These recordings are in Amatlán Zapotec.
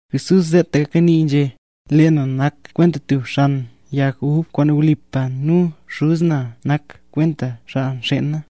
Jesús seetaka nii nu nzhé: —Lee na nak kwenta tub xan yag ub kwaan wlipa, nu Xuz na nak kwenta xaa nxeen na.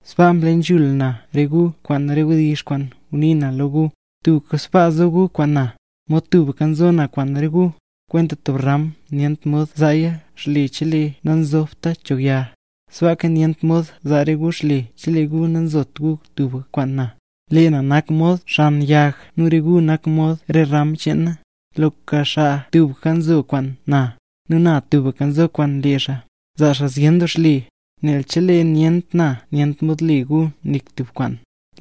Sbaa mle nzhula na re gu kwaan re wdizh kwaan ngunii na lo gu. Tubka sbaa zo gu kwaan na, mod tubka nzo na kwaan re gu. Kwenta tub ram nyent mod zaaya xle chelee nanzobta cho yag; sbaaka nyent mod zaa re gu xle chelee gu nanzot gu tubka kwaan na. ’Lee na nak mod xan yag nu re gu nak mod re ram cheen na. Loka xaa tubka nzo kwaan na, nu na tubka nzo kwaan lee xaa, zaa xaa zyen doo xle; nel chelee nyent na nyent mod le gu nik tub kwaan.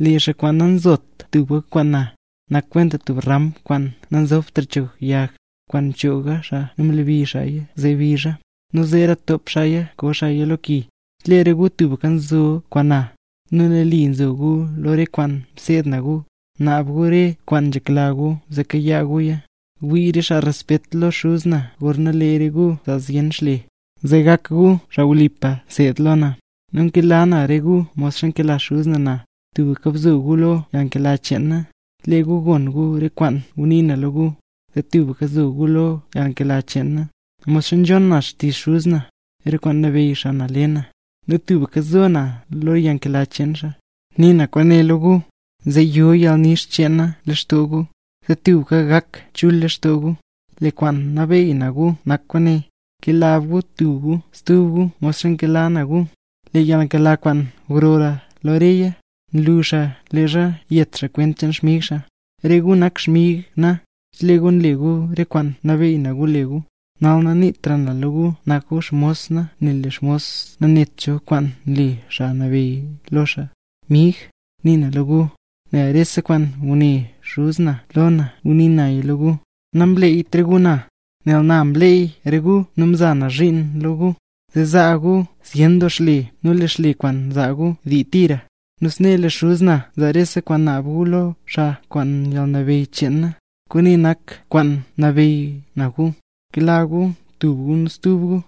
Lee xaa kwaan nanzot tubka kwaan na, nak kwenta tub ram kwaan nanzobtra cho yag, kwaan mchoog xaa nu mlebi xaa zee bizha, nu zeera top xaaya koo xaaya lo ki. ’Chelee re gu tubka zo kwaan na, nu nali zo gu lo re kwaan mseed na gu, bnaab gu re kwaan nzhekla gu zee kayaa guya. Wii re xaa respet lo Xuz na gorna lee re gu nzaa zyen xle, zee gak gu xaa wlipa nseed lo na. Nu nkela na re gu modxa nkela Xuz na na; tubka bzo gu lo yalnkela cheen na. Chelee gu gon gu re kwaan ngunii na lo gu, zee tubka nzo gu lo yalnkela cheen na; modxa nzhon na xtizh Xuz na, re kwaan mnabeyy xaa le na, nu tubka nzo na lo yalnkela cheen xaa. ’Nii na kwaane lo gu, zee yo yalnix cheen na lextoo gu, zee tubka gak chul lextoo gu. Lee kwaan nabeey na gu nak kwaane: Kela gu tub gu stub gu modxa nkela na gu. Lee yalnkela kwaan grora lo reya, nlu xaa leezha yet xaa kwent cheen xmig xaa. Re gu nak xmig na, chelee gu nle gu re kwaan mnabeey na gu le gu. Nal naniitra na lo gu nak gu xmos na, nel lee mos nanet cho kwaan nle xaa nabeyy lo xaa. Mig, nii na lo gu, nel rese kwaan nguné Xuz na lo na nguniila naya lo gu. Namleeyt re gu na, nel na mleey re gu nu mza na zhiin lo gu, zee zaa gu zyen doo xle nu lee xle kwaan zaa gu dii tira. Nu snee lee Xuz na zaa rese kwaan naab gu lo xaa kwaan yalnabeyy cheen na. Kwaane nak kwaan nabeey na gu: Kela gu tub gu stub gu.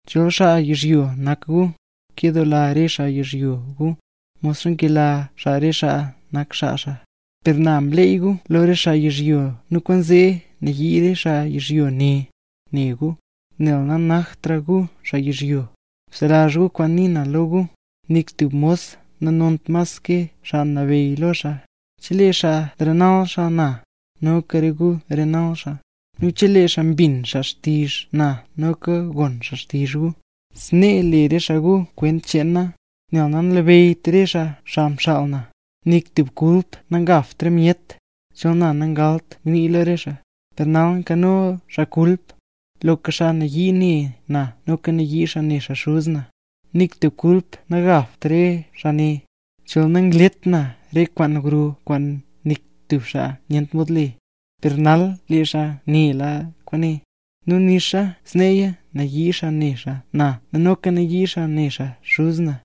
Chol xaa yizhyo nak gu, kedoola re xaa yizhyo gu, mod nkela xaa re xaa nak xaa xaa. Per na mleey gu lo re xaa yizhyo nu kwaanzee nayii re xaa yizhyo ne, ne gu, nel nanaktra gu xaa yizhyo. Bselazh gu kwaan nii na lo gu: “Nik tub mos nanont mas ke xaa nabeyy lo xaa”. Chelee xaa nrenal xaa na, noka re gu renal xaa; nu chelee xaa mbin xaa xtizh na noka gon xaa xtizh gu. Snee le re xaa gu kwent cheen na, nel nanlabeyyt re xaa xaa mxaal na. ’Nik tub kulp nangabt re myet, chol na nangalt ngnii lo re xaa. Per nal nkano xaa kulp. Loka xaa nayii ne na noka nayii xaa ne xaa Xuz na. Nik tub kulp nagabt re xaa ne, chol nanglet na re kwaan gro kwaan nik stub xaa nyent mod le. Per nal lee re xaa nela kwaane, nu nixa sneeya nayii xaa ne xaa na nu noka nayii xaa ne xaa Xuz na.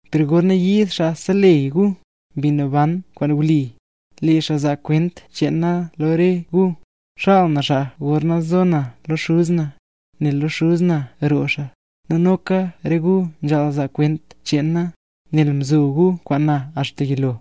’Per gorna yiid Xaa Seleyy gu, Mbi Naban kwaan wli, lee xaa zaa kwent cheen na lo re gu. Xaal na xaa gorna zo na lo Xuz na, nel lo Xuz na roo xaa. Nu noka re gu nzhaal zaa kwent cheen na, nel mzo gu kwaan na axta yilo.